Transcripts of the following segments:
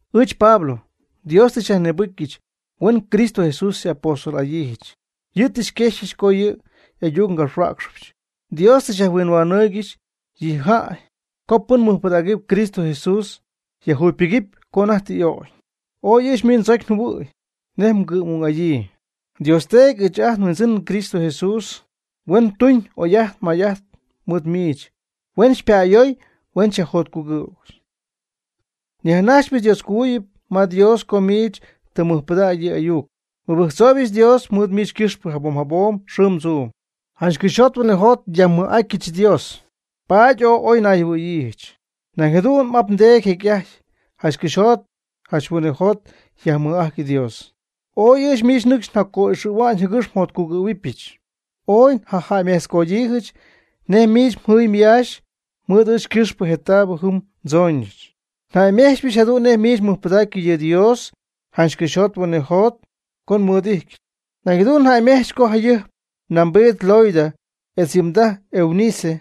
Ɨɨch Pablo, Dios tɨ xyajnïbɨcyɨch huen Cristo Jesús xy'apóstol'adyiijɨch. Yɨ' tɨ xyquexyɨch co yɨ' y'ayuc ngapxhuäcxɨbɨch. Dios tɨ yajhuinhuanɨɨygɨxy yɨ jäy co pɨn mɨjpɨdägɨpy Cristo Jesús yajjugypɨgɨpy co anajty tɨ y'ögy. Ooy ɨɨch miich ndzocy njɨhuɨ̈y nej ngɨ'm'ung'adyii. Dios Teedy etz ɨɨch ajt nHuindzɨn Cristo Jesús huen tuñ oy'ajt may'ajt mɨɨd miich, huen xypa'ayooy, huen xyyajjotcugɨ̈y. Nyajnajxypɨch Dioscojuyip ma Dios co miich tɨ mmɨjpɨdäg yɨ' y'ayuc. Nmɨbɨjctzooybɨch Dios mɨɨd miich ycɨxpɨ jabom jabom xɨɨm tzuum. Janch cɨxyjot huinɨjot nyajmɨj'atyɨch Dios, paady ooy oy nayjɨhuɨ̈yiijɨch. Nañ jadu'n n'ap ndeedy jecy'ajty janch cɨxyjot janch huinɨjot yajmɨj'ajty Dios. Ooy miich nɨcxy njaco'ixɨ̈hua'ñ jɨgɨx njotcugɨ̈huɨbɨch. Ooy njajäymejtzcoodyiijɨch nej miich mjɨɨy myaax mɨɨd ɨɨch ycɨxpɨ je taabɨ jɨm ndzooñɨch. Njäymejtzpɨch jadu'n nej miich mmɨjpɨdägy yɨ Dios janch cɨxyjot huinɨjot co xymɨɨd'ityɨch. Nañ njäymejtzpɨch co jayɨjp mnambiid Loida etz yɨ mdaj Eunice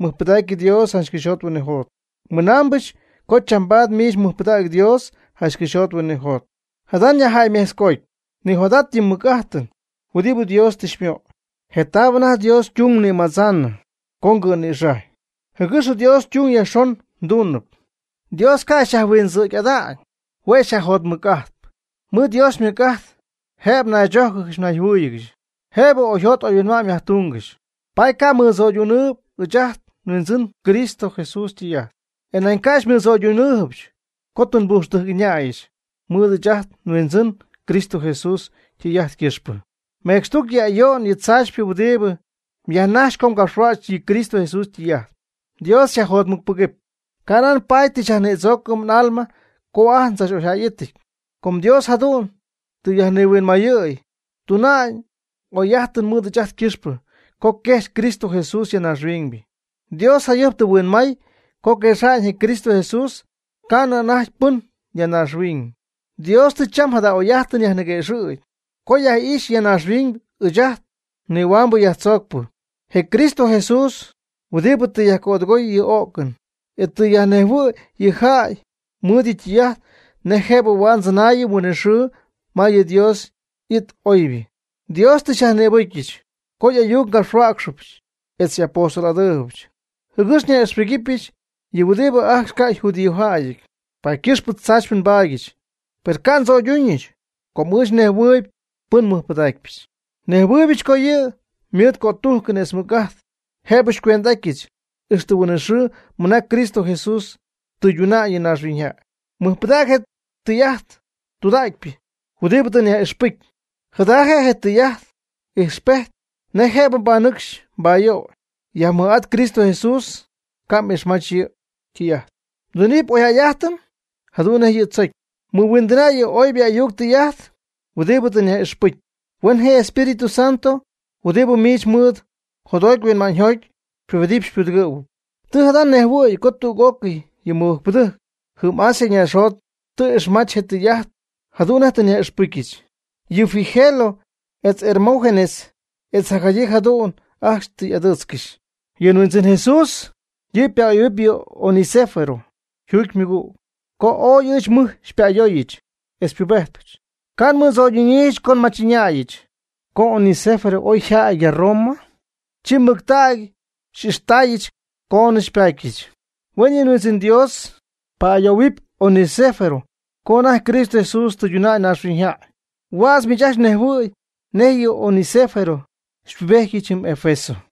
mɨjpɨdacy Dios janch cɨxyjot huinɨjot. Mɨnambɨch co chambaad miich mmɨjpɨdägy Dios janch cɨxyjot huinɨjot. Jada nyajjäymejtzcootpy: Nijot'at yɨ mɨc'ajtɨn huɨdibɨ Dios tɨ xymöy, je taab anajty Dios ytung mnïmadzaanɨ co ngɨ'nïxajy, jɨgɨx Dios ytung jacyajxon mduunɨpy. Dios ca' xyajhuindzɨ̈gy'aty, hue' xyajjotmɨc'ajtp. Mɨɨd Dios ymɨc'ajt jëb mnaychójcɨgɨxy mnayjɨhuɨ́ɨyɨgɨxy, jëb oyjot oyhuinma'ñ myajtuungɨxy. Paady ca' mmɨdzöydunɨɨyb ɨɨch ajt nHuindzɨn Cristo Jesús ytɨy'ajt. E nañ ca' xymɨdzöydunɨɨybɨch co tɨ nbujxtɨjc ɨñäyɨch mɨɨd ɨɨch ajt nHuindzɨn Cristo Jesús ytɨy'ajt ycɨxpɨ. Mecxtuc yɨ ayo'n yɨ tzaachypɨ huɨdibɨ myajnajxpy co mgapxhuäcxy yɨ Cristo Jesús ytɨy'ajt. Dios xyajjotmɨcpɨgɨpy. Canan paady tɨ xyajnïdzoocɨm n'alma co ajt ndzach'oyjäyɨty. Com Dios jadu'n tɨ yajnihuinmayɨ̈y tuna'ñ oy'ajtɨn mɨɨd ɨɨch ajt ycɨxpɨ co quejxy Cristo Jesús ya naaxhuiñ. Dios jayɨjp tɨ huinmay co quexa'ñ je Cristo Jesús ca'nɨ anajty pɨn ya naaxhuiñ. Dios tɨ cham jada oy'ajtɨn yajniguëxɨ̈gy co yaj'ijxy ya naaxhuiñ ɨɨch ajt nnihuambɨ nyajnïdzoocpɨ, je Cristo Jesús, huɨdibɨ tɨ yajcödɨgoy yɨ o'cɨn. E tɨ yajnejhuɨ̈y yɨ jäy mɨɨd yɨ' ytɨy'ajt nej jëb huaad ndzɨnaayɨm huinɨxɨɨ ma yɨ Dios y'it oybɨ. Dios tɨ xyajnïbɨcyɨch co y'ayuc ngapxhuäcxɨch, etz xy'apóstol'adyiijɨch jɨgɨx nyaj'ixpɨgɨpyɨch yɨ huɨdibɨ ajcxy ca' yjudíojäyɨty. Paady ycɨxpɨ tzaachypɨ nbaadyɨch. Per ca' ndzo'yduñɨch, com ɨɨch nejhuɨɨyb pɨn nmɨjpɨdacpyɨch, nejhuɨɨybɨch co yɨ' ymɨɨd cötujcɨn etz mɨc'ajt jëb xycuend'adɨpyɨch, ixtɨ huin'it xɨɨ mɨnaa Cristo Jesús tɨyduna'ñ yɨ naaxhuiñyjäy. Mɨjpɨdäg je tɨy'ajt tɨydudägypɨ huɨdibɨ tɨ nyaj'ixpɨcy, jada je' tɨy'ajt ijxpejt nej jëb mbanɨcxy mbayöy. Yajmɨj'at Cristo Jesús, ca' m'ixmajtzɨ yɨ' ytɨy'ajt, mdunɨpy oyjäy'ajtɨn jadu'n nej yɨ' tzocy. Mɨhuindɨna' yɨ oybɨ ayuc tɨy'ajt huɨdibɨ tɨ nyaj'ixpɨcy. Huen je Espíritu Santo huɨdibɨ miich mɨɨd jotjoty huinma'ñyjoty xypubedɨpy xypudɨgɨ̈huɨpy. Tɨ jada' mnejhuɨ̈y co tüg'ócɨy yɨ mɨbɨjcpɨdɨjc jɨm Asia naaxjot tɨ ixmach je tɨy'ajt jadu'n nej tɨ nyaj'ixpɨcyɨch. Yɨ Figelo etz Hermógenes etz jacjadyii jadu'n ajcxy tɨ y'adɨɨtzcɨxy. Yɨ Huindzɨn Jesús yɨ' pa'ayoohuɨpy yɨ Onesífero yjuugy ymɨgüg, com ooy ɨɨch mɨj xypa'ayooyɨch etz xypubejtyɨch, ca' xymɨdzo'ydunyiijɨch co nmach'ɨñäyɨch. Co Onesífero oyja'ty ya Roma, chi mɨctägy xy'ixtaayɨch coonɨ xypatyɨch. Huen yɨ Huindzɨn Dios ypa'ayoohuɨɨgy Onesífero co anajty Cristo Jesús tɨyduna'ñ naaxhuiñyjäy. Huädz miich mnejhuɨ̈y nej yɨ Onesífero xypubejtyɨch jɨm Efeso.